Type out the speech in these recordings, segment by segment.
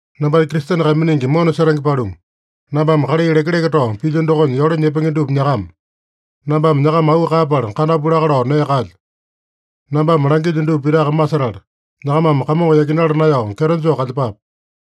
Nambanya Kristene kaiminingi mona setenge paluma, nambame kalai lekeleke tao pilyo dokonya yole nyepenge dupa nyakama. Nambame nyakama auu kaeyapala kandapu laka lao nee kaelyo. Nambame langilyo dupa pitaka masetala, nyakamame Kamongo yakinala naeyao kyeto joo kalyepape.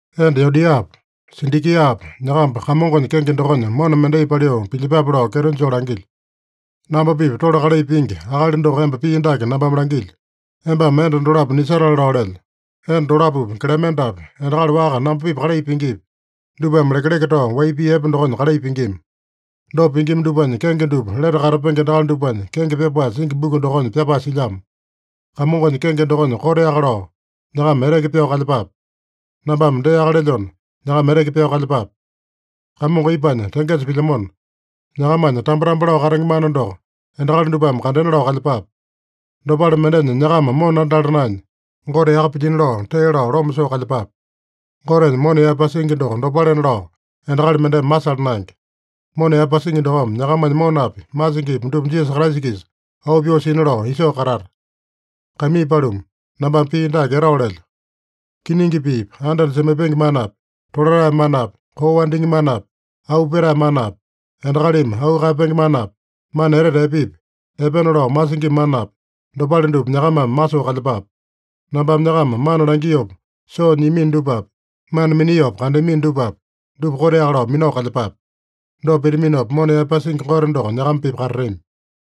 Enda Yodiapa, Sindikiapa, nyakamba Kamongonya kenge dokonya mona mendai paliu pilyepape lao kyeto joo langilyo. Namba-pipa tole kalai pingi akali doko emba pii dake nambame langilyo: Embame enda dolapo nisatale lao lelyo. Enda dolapopi, Klemendapi, endakali waka namba-pipa kalai pingipi, dupame lekeleke tao wai pii epe dokonya kalai pingima. Dopa pingima dupanya kenge dupa lete katapenge endakali dupanya kenge pyapae singi buku dokonya pyapae silyamo. Kamongonya kenge dokonya koteaka lao nyakama eteke pyao kalyepape. Nambame deaka lelyona, nyakama eteke pyao kalyepape. Kamongo ipanya tengesa pilyamona, nyakamanya tambo-tambo lao katenge mana doko endakali dupame kandena lao kalyepape. Dopale mendenya nyakama mona andala naenya, Gote yaka pilyino lao, tee lao loma soo kalyepape. Gotenya mona yaepasingi doko dopalena lao endakali mendeme masala naenge. Mona yaepasingi dokome nyakamanya monapi, masingipi dupa Jisasa Kraisa-kisa auu pyoo sina lao isoo katata. Kaimii paluma, nambame pii dake etao lelyo: Kiningi piipi, anda-anda semaipenge manapi, tolatae manapi, koo wandingi manapi, auu petae manapi, endakalimi auu kaeyapenge manapi, mana etete epepi, epena lao masingima manapi, dopale dupa nyakamame masoo kalyepape. Nambame nyakama mana langiopa soo nyiamino dupapi, mana miniopa kandeamino dupapi, dupa koteaka lao minao kalyepape. Dopa pitaminopa, mona yaepasingi Gote doko nyakama-pipa katatami.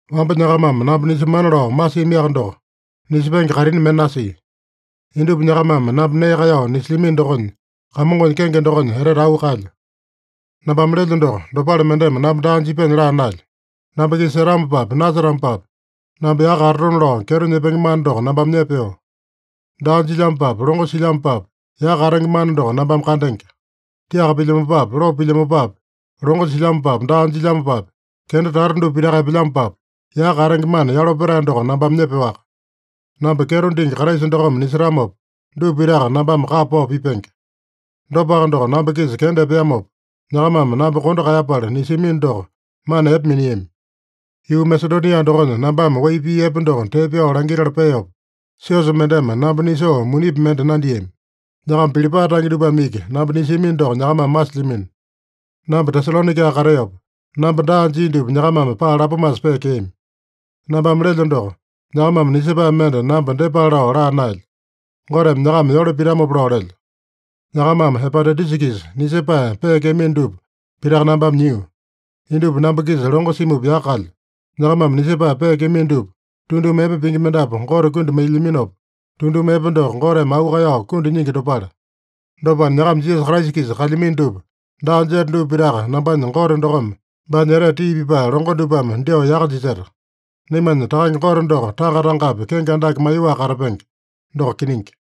Wamba nyakamame namba nisemana lao masiamiaka doko, nisepenge kaitini mende nasia. Indupa nyakamame namba nee kaeyao nisilyamino dokonya, Kamongonya kenge dokonya etete auu kaelyo. Nambame lelyo doko, dopale mendeme namba daa jipyanya laa naelyo. Namba-kisa setamopapi, nasetamopapi, namba yaka katatona lao kyeto nyepenge mana doko nambame nyepeo. Daa jilyamopapi, longo silyamopapi, yaka katenge mana doko nambame kandenge. Tiaka pilyamopapi, lopo pilyamopapi, longo silyamopapi, daa jilyamopapi, kenda tata dupa pitaka epelyamopapi, yaka katenge mana yalo petae doko nambame nyepeowaka. Namba kyeto dingi Kraisa dokome nisetamopa, dupa pitaka nambame kapa pao pipenge. Dopaka doko, namba-kisa kenda epeamopa, nyakamame namba kondo kaeyapala nisiamino doko, mana epe miniami. Yuu Masedonia dokonya nambame wai pii epe doko tee pyao langitala peopa, siosa mendeme namba nisoo munipi mende nandiami. Nyakama Pilipae tange dupame iki namba nisiamino doko nyakamame masilyamino. Namba Tesalonaika kateopa, namba daa jia dupa nyakamame paa lapomasa peekeami. Nambame lelyo doko, nyakamame nisepae mende namba dyepale lao laa naelyo. Goteme nyakama yole pitamopa lao lelyo. Nyakamame Epapodaitusa-kisa nisepae peekeamino dupa pitaka nambame nyio. Indupa namba-kisa longo simupa yaka kalyo. Nyakamame nisepae peekeamino dupa, tunduma epe pingi mendapu Gote kundi mailyaminopa, tunduma epe doko Goteme auu kaeyao kundi nyingi dopale. Dopana, nyakama Jisasa Kraisa-kisa kalyamino dupa daa jeta dupa pitaka nambanya Gote dokome baanya etete tii pipae longo dupame dyoo yaka jiseta. Naimanya Takange Gote doko tanga-tangapi kenge andake maiyoaka katapenge. Doko kiningi.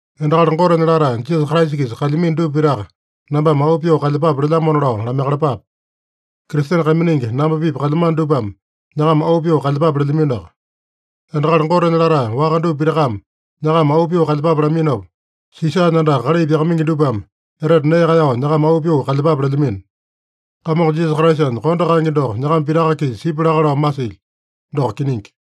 Endakali Gotenya latae, Jisasa Kraisa-kisa kalyamino dupa pitaka nambame auu pyoo kalyepape lelyamona lao lamaiyakalapape. Kristene kaiminingi namba-pipa kalyamano dupame nyakama auu pyoo kalyepape lelyaminoaka. Endakali Gotenya latae waka dupa pitakame nyakama auu pyoo kalyepape laminopa, Sisanya andaka kalai pyakamaingi dupame etete nee kaeyao nyakama auu pyoo kalyepape lelyamino. Kamongo Jisasa Kraisanya kondo kaenge doko nyakama pitaka-kisa sipya laka lao masilyo. Doko kiningi.